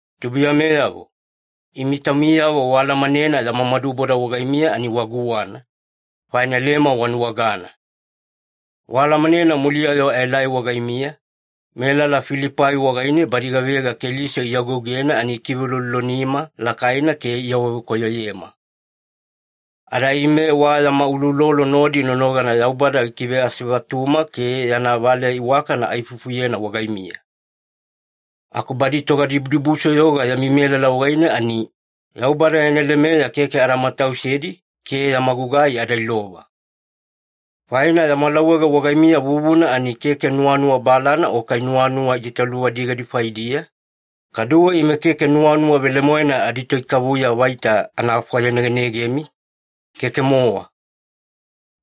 Tubuiyameyavo, imi taumiyavo waalamanena yama maduboda wagaimiya ani wa guwana, faina leme wanuwagana. Waalamanena muliya-yo aelai wagaimiya, melala Filipai wagaine badi gavega Keliso iagougena ani ikiveuloulolonima lakaina ke iawavekoyoyema. Ada ime wa yama uloulolo nodi nonogana Yaubada gikiveasevatuma ke yana valeya iwakana aifufuyena wagaimiya. Aku badi togadibudibusoyoga yami melala wagaine ani, Yaubada yana lemeya keke ada matausedi ke yama gugai ada ilova. Faina yama lauwage wagaimiya vuvuna ani keke nuwanuwa balana o kai nuwanuwa itaitaluvadigadi faidiya, kaduwe ime keke nuwanuwa velemoena aditoikavuya vaita ana fwayanegenegemi, keke-mowa.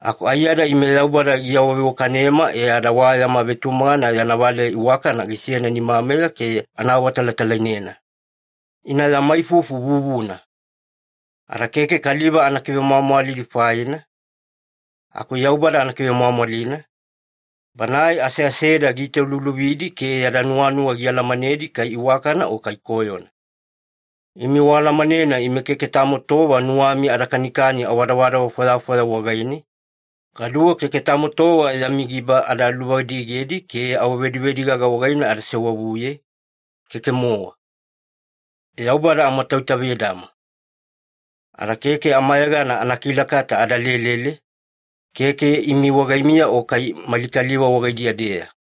Aku aiyada ime Yaubada giawaveiwakanema e ada wa yana vetumagana yana valeya iwakana gisena nimameya ke ana awaawatalatalainena. Ina yama ifufu vuvuna. Ada keke kaliva ana kivemwamwalidi faina, aku Yaubada ana kivemwamwalina, Banae aseaseda giitauluuluvidi ke yada nuwanuwa gialamanedi kai iwakana o kai koyona. Imi waalamanena ime keke tamo tova nuwami ada kanikani awadavadava fwayafwaya wagaine, kaduwe keke tamo tova yami giba ada luvadigedi ke awavedivedigaga wagaine ada sewavuye, keke-mowa. Yaubada amatoitavedama. Ada keke amayegana anakilakata ada lelele, keke imi wagaimiya o kai mali kaliva wagaidiya-deya.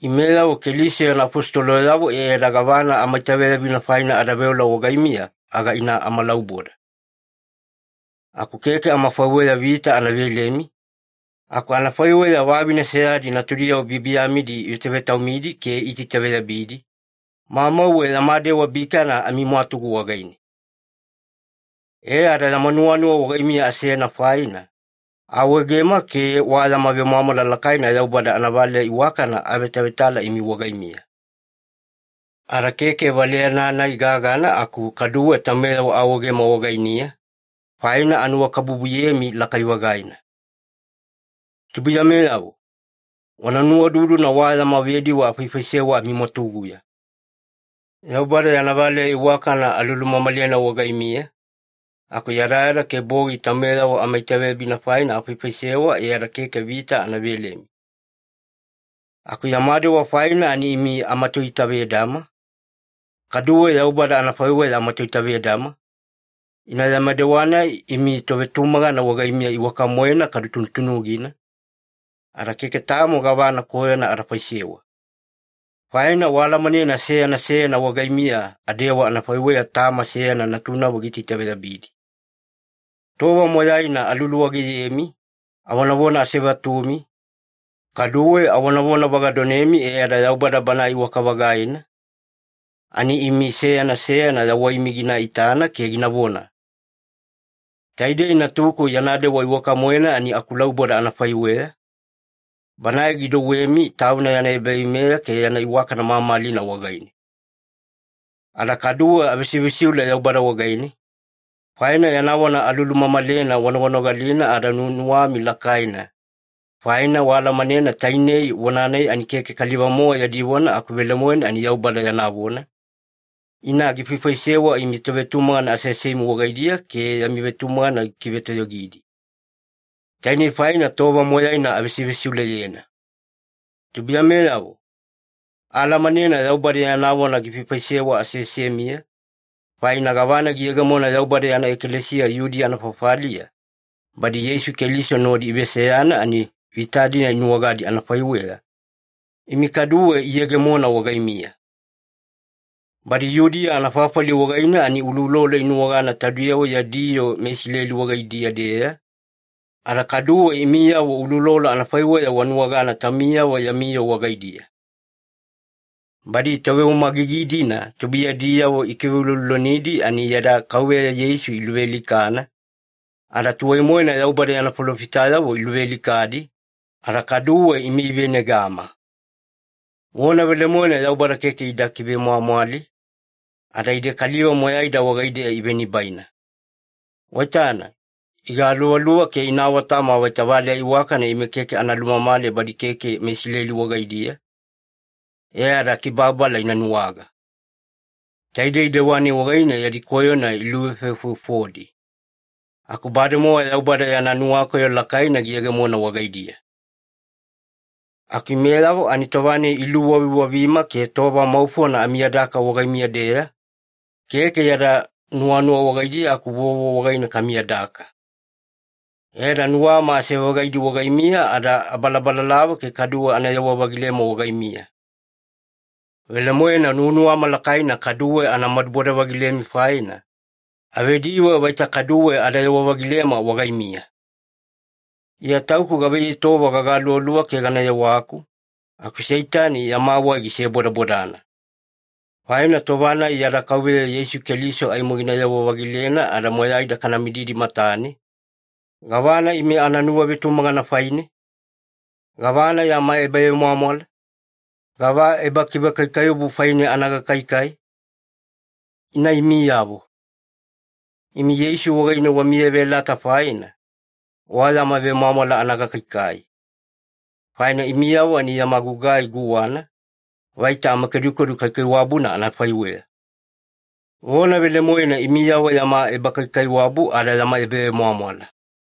Imeyavo Keliso yana afositoloyavo e ada gavana amaitaveyabina faina ada veola wagaimiya, aga ina amalauboda. Aku keke amafaiweya vita ana velemi, aku anafaiweya vavine seyadi natudiyavo biyabiyamidi ivetavetaumidi ke iitaitaveyabidi, mamauwe yama dewa bikana amimwatugu wagaine. E ada yama nuwanuwa wagaimiya asena faina, aawaegema ke wa yama vemwamwala lakaina Yaubada anavaleya iwakana aavetavetala imi wagaimiya. Ada keke valeyana-nai gagana aku kaduwe taumeyavo aawaegema wagaimiya, faina anuwakabubuyemi lakai-vagaina. Tubuiyameyavo, wana nuwaududuna wa yama vediwe afaifaisewa amimwatuguya. Yaubada yana valeya iwakana alulumamalena wagaimiya, aku yadayada ke bogi taumeyavo amaitaveyabina faina afaifaisewa e ada keke vita ana velemi. Aku yama dewa faina ani imi amatoitavedama, kaduwe Yaubada anafaiweya amatoitavedama, ina yama dewa-nai imi tovetumagana wagaimiya iwaka-moena kadu tunutunugina, ada keke tamo gavana koyona ada faisewa. Faina waalamanena seyana seyana wagaimiya adewa anafaiweya tama seyana natunavo giitaitaveyabidi. Tova moyaina aluluwageyemi, avonavona asevatumi, kaduwe avonavona vagadonemi e ada Yaubada Banae iwaka-vagaina ani imi seyana seyana yawaimi gina itana ke ginavona, “Taidei natuku yana dewa iwaka-moena ani akulauboda anafaiweya,” Banae gidouwemi Tauna yana ebaveimeya ke yana iwakana mamalina wagaine. Ada kaduwe avesivesiule Yaubada wagaine, faina yana vona alulumamalena wanoganogalina ada nuwanuwami lakaina, faina waalamanena tainei vona-nai ani keke kaliva-mowa yadi vona aku velemoena ani Yaubada yana vona, ina gifaifaisewa imi tovetumagana aseasemi wagaidiya ke yami vetumagana gikivetoyogidi. Tainei faina tova moyaina avesivesiuleyena. Tubuiyameyavo, aalamanena Yaubada yana vona gifaifaisewa aseasemiya, faina gavana giyegemona Yaubada yana ekalesiya Yudiya anafafaliya, badi Yeisu Keliso nodi iveseyana ani vita-dina inuwagadi anafaiweya, imi kaduwe iyegemona wagaimiya. Badi Yudiya anafafali wagaine ani uloulolo inuwagana taudiyavo yadi yoo meIsileli wagaidiya-deya, ada kaduwe imiyavo uloulolo anafaiweya wanuwagana taumiyavo yami yoo wagaidiya. Badi toveumagigi-dina tubuiyadiyavo ikiveuloulolonidi ani yada Kauveya Yeisu iluvealikana, ada tuwai-moena Yaubada yana falofitayavo iluvealikadi, ada kaduwe ime ivenegama. Vona velemoena Yaubada keke ida kivemwamwali, ada ide kaliva moyaida wagaideya ivenibaina. Waitana, igaluvaluva ke ina awatama vaita valeya iwakana ime keke ana lumamale badi keke meIsileli wagaidiya e ada kibababala ina nuwaga. Taidei dewa-nai wagaine yadi koyona iluvefovefofodi. Aku bademowa Yaubada yana nuwakoyo lakaina giyegemona wagaidiya. Aku imeyavo ani tova-nai iluwaviwavima ke tova maufona amiyadaka wagaimiya-deya, keke yada nuwanuwa wagaidiya aku vovo wagaine kamiyadaka. E ada nuwama ase-vagaidi wagaimiya ada abalabalalava ke kaduwe anayewa-vagilema wagaimiya. Velemoena nuwanuwama lakaina kaduwe ana maduboda-vagilemi faina, avediwe vaita kaduwe adayewa-vagilema wagaimiya. Iya tauku gavaiyei tova gagaluvaluva ke gana yewaku, aku Seitani yama wai gisebodabodana. Faina tova-nai yada Kauveya Yeisu Keliso aimo ginayewa-vagilena ada moyaida kana mididi matane, gavana ime ana nuwavetumagana faine? Gavana yama ebavemwamwala? Gava ebakivekaikaiwabu faine ana gakaikai? Ina imiyavo. Imi Yeisu wagaine wamiyaveyalata faina, wa yama vemwamwala ana gakaikai. Faina imiyavo ani yama gugai guwana, vaita amakedukedu kaikaiwabuna anafaiweya. Vona velemoena imiyavo yama ebakaikaiwabu ada yama ebavemwamwala.